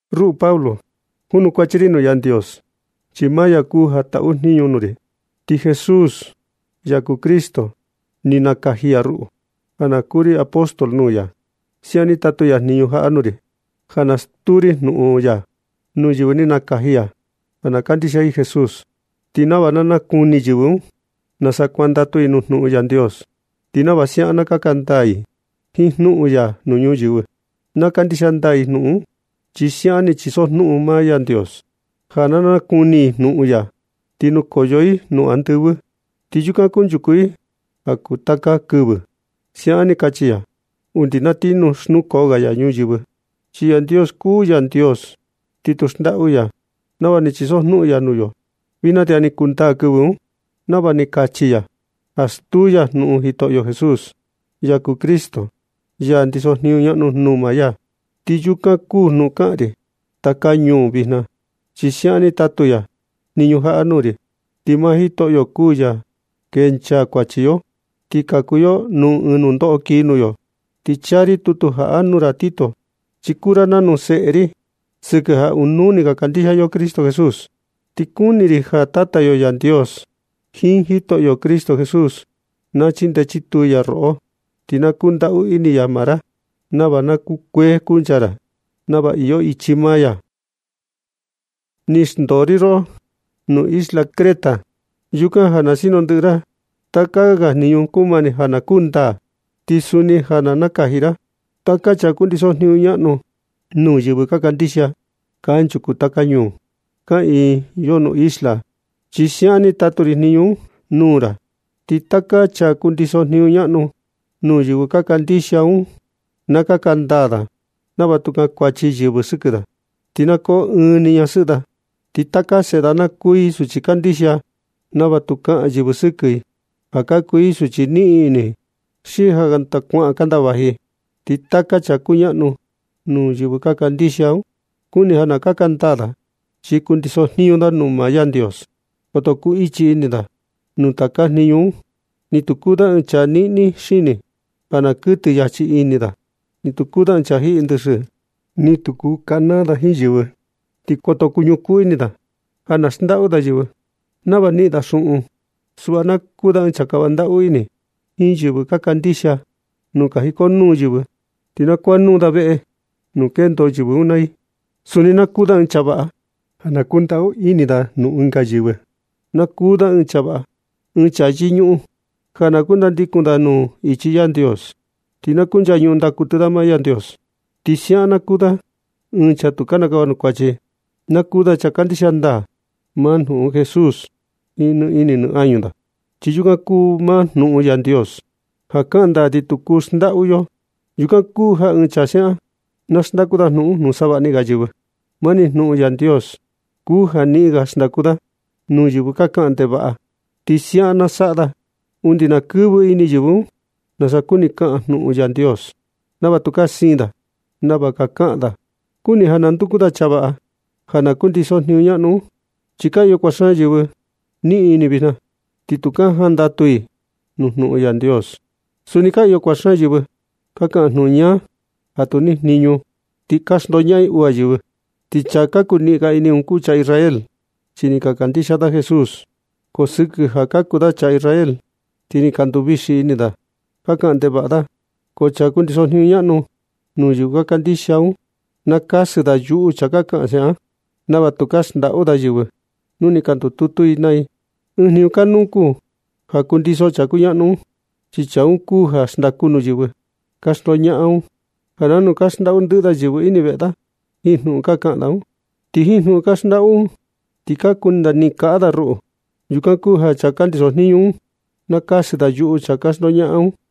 Ruꞌu Pablo, junukuachi ri nuu Yandios, chi maa ya kuu ja taꞌu jniñu nuu ri. Ti Jesús, ya kuu Cristo, ni nakaji ya ruꞌu ja na kuu ri apóstol nuu ya. Siaꞌan ni tatu ya jniñu jaꞌa nuu ri, ja na stuu ri jnuꞌun ya nuu yɨvɨ ni nakaji ya ja na kandixia i Jesús, ti nava na nakuni yɨvɨ un nasa kuandatu i nuu jnuꞌun Yandios, ti nava siaꞌan na kaka ndaa i jiin jnuꞌun ya nuu ñuyɨvɨ. Na kandixia ndaa i jnuꞌun un chi siaꞌan ni chisojnuꞌun maa Yandios ja nu na nakuni i jnuꞌun ya, ti nukoyo i nuu andɨvɨ, ti yukan kunchuku i ja kuu taka kɨvɨ. Siaꞌan ni kachi ya undi na ti xnukoo ga ya ñuyɨvɨ. Chi Yandios kuu Yandios, ti tu xndaꞌu ya nava ni chisojnuꞌun ya nuu yo. Vijna ti ja ni kundaa kɨvɨ un nava ni kachi ya ja stuu ya jnuꞌun Jitoꞌo Jesús, ya kuu Cristo, ya ndiso jniñu ñaꞌnu nuu maa ya. Ti yukan kuu jnuꞌun kaꞌan ri taka ñuu vijna, chi siaꞌan ni tatu ya jniñu jaꞌa nuu ri. Ti maa Jitoꞌo kuu ya kencha kuachi yo ti kaku yo nuu ɨɨn nundoꞌo kii nuu yo. Ti chaa ri tutu jaꞌa nuu ra Tito, chi kuu ra nanu ɨɨn seꞌe ri sɨkɨ ja ɨɨn nuu ni ka kandixia yo Cristo Jesús. Ti kuni ri ja Tata yo Yandios jiin Jitoꞌo Cristo Jesús, na chindee chituu ya roꞌo, ti na kundaꞌu ini ya maa ra, nava na kukuee kuncha ra nava iyo ichi maa ya. Ni xndoo ri roꞌo nuu isla Creta yukan ja na sinu ndɨꞌɨ ra taka ga jniñu kumani ja na kundaa. Ti suni ja na nakaji ra taka chaa kundiso jniñu ñaꞌnu nuu yɨvɨ ka kandixia kanchuku taka ñuu ka iyo nuu isla un. Chi siaꞌan ni tatu ri jniñu un nuu ra. Ti taka chaa kundiso jniñu ñaꞌnu nuu yɨvɨ ka kandixia un, na kaka ndaa da nava tu kankuachi yɨvɨ sɨkɨ da. Ti na koo ɨɨn ni ñasɨꞌɨ da. Ti taka seꞌe da na kuu i suchi kandixia, nava tu kaꞌan yɨvɨ sɨkɨ i ja ka kuu i suchi niꞌin ini, xi ja kanda kuaꞌan kanda vaji i. Ti taka chaa kuñaꞌnu nuu yɨvɨ ka kandixia un, kuni ja na kaka ndaa da, chi kundiso jniñu da nuu maa Yandios. Koto kuu ichi ini da nuu taka jniñu, ni tu kuu da ɨɨn chaa niꞌni xini ja na kuɨtɨ yachi ini da, ni tu kuu da ɨɨn chaa jiꞌi ndɨxɨ, ni tu kuu kanaa da jiin yɨvɨ, ti koto kuñukuu ini da ja na xndaꞌu da yɨvɨ nava na niꞌin da xuꞌun. Suꞌva na kuu da ɨɨn chaa kava ndaꞌu ini jiin yɨvɨ ka kandixia, nu ka jikonuu yɨvɨ, ti na kuaꞌa nuu da veꞌe nuu kendo yɨvɨ un naa i. Suni na kuu da ɨɨn chaa vaꞌa ja na kundaꞌu ini nuu ɨnga yɨvɨ. Na kuu da ɨɨn chaa vaꞌa, ɨɨn chaa yɨñuꞌun ja na kundandikun da nuu ichi Yandios. Ti na kunchañuꞌun ndaa kuɨtɨ da maa Yandios, ti siaꞌan na kuu da ɨɨn chaa tu kinikava nuu kuachi. Na kuu da chaa kandixia ndaa maa jnuꞌun Jesús jiin nɨ ini nɨ añu da, chi yukan kuu maa jnuꞌun Yandios ja kaꞌan ndaa ti tu kuu xndaꞌu yo. Yukan kuu ja ɨɨn chaa siaꞌan, na xndaku da jnuꞌun un nuu savaꞌni ga yɨvɨ. Mani jnuꞌun Yandios kuu ja niꞌin ga na xndaku da nuu yɨvɨ ka kaꞌan ndevaꞌa, ti siaꞌan na saꞌa da undi na kɨvɨ ini yɨvɨ un nasa kuni kaꞌan jnuꞌun Yandios, nava tukaa siin da nava ka kaꞌan da. Kuni ja na nduku ra chaa vaꞌa ja na kundiso jniñu ñaꞌnu un, chi ka iyo kuaꞌa xaan yɨvɨ niꞌin ini vijna, ti tu ka jandatu i nuu jnuꞌun Yandios. Suni ka iyo kuaꞌa xaan yɨvɨ ka kaꞌan jnuꞌun ñaa ja tu nijniñu, ti ka xndoñaꞌan i uu ga yɨvɨ. Ti chaa niꞌin ga ini un ka kuu chaa Israel, chi ni ka kandixia da Jesús, ko sɨkɨ ja ka kuu da chaa Israel, ti ni ka nduvixi ini da, ka kaꞌan ndevaꞌa da. Ko chaa kundiso jniñu ñaꞌnu nuu yɨvɨ ka kandixia un, na kasɨ da yuꞌu chaa ka kaꞌan siaꞌan un nava tukaa ga xndaꞌu da yɨvɨ nu ni ka ndututu i naa i. Ɨɨn jniñu kanuu kuu ja kundiso chaa kuñaꞌnu un, chi chaa un kuu ja xndaku nuu yɨvɨ ka xndoñaꞌan un, ja nanu ka xndaꞌu ndɨꞌɨ da yɨvɨ ini veꞌe da jiin jnuꞌun ka kaꞌan da un. Ti jiin jnuꞌun ka xndaꞌu da un ka kuni da niꞌin kaꞌa da ruꞌu. Yukan kuu ja chaa kundiso jniñu un, na kasɨ da yuꞌu chaa ka xndaꞌu un naa da.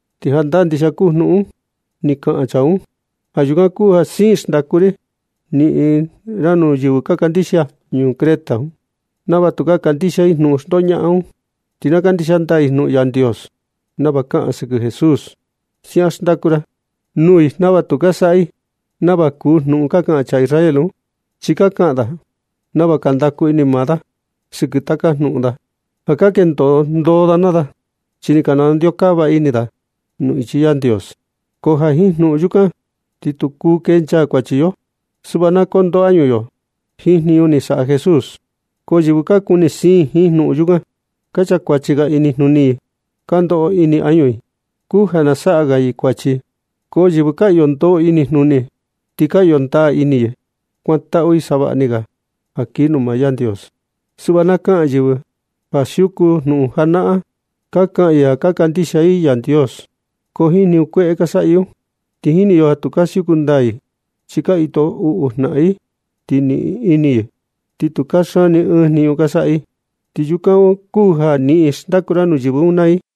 Ti jandaa ndixia kuu jnuꞌun ni kaꞌan chaa un. Ja yukan kuu ja siin xndaku niꞌin ra nuu yɨvɨ ka kandixia ñuu Creta un, nava tukaa kandixia i jnuꞌun xndoñaꞌan un naa i, ti na kandixia ndaa i jnuꞌun Yandios nava kaꞌan sɨkɨ Jesús. Siaꞌan xndaku ra nuu i nava tu ka saꞌa i nava nuu jnuꞌun ka kaꞌan chaa Israel un, chi ka kaꞌan da nava ka ndaku ini maa da sɨkɨ taka jnuꞌun da ja na kendo ndoo da naa da, chi ni ka nandeokava ini da nuu ichi Yandios. Ko ja jiin jnuꞌun yukan, ti tu kuu kencha kuachi yo. Suꞌva na kondoo añu yo jiin jniñu ni saꞌa Jesús. Ko yɨvɨ ka kuni siin jiin jnuꞌun yukan, ka chakuachi ga i inijnuni i. Chi ja ndoꞌo ini añu i kuu ja na saꞌa ga i kuachi. Ko yɨvɨ ka iyo ndoo inijnuni, ti ka iyo ndaa ini i kuantaꞌu i savaꞌni ga ja kii nuu maa Yandios. Suꞌva ka kaꞌan yɨvɨ ka siuku jnuꞌun janaꞌan, ka kaꞌa i ja ka kandixia i Yandios, ko jiin jniñu kueꞌe ka saꞌa i un, ti jini yo ja tu ka siuku ndaa i, chi ka jito uꞌu jnaꞌan i, ti niꞌin ini i, ti tu kaxaan ni ɨɨn jniñu ka saꞌa i. Yukan kuu ja niꞌin na xndaku ra nuu yɨvɨ un naa i.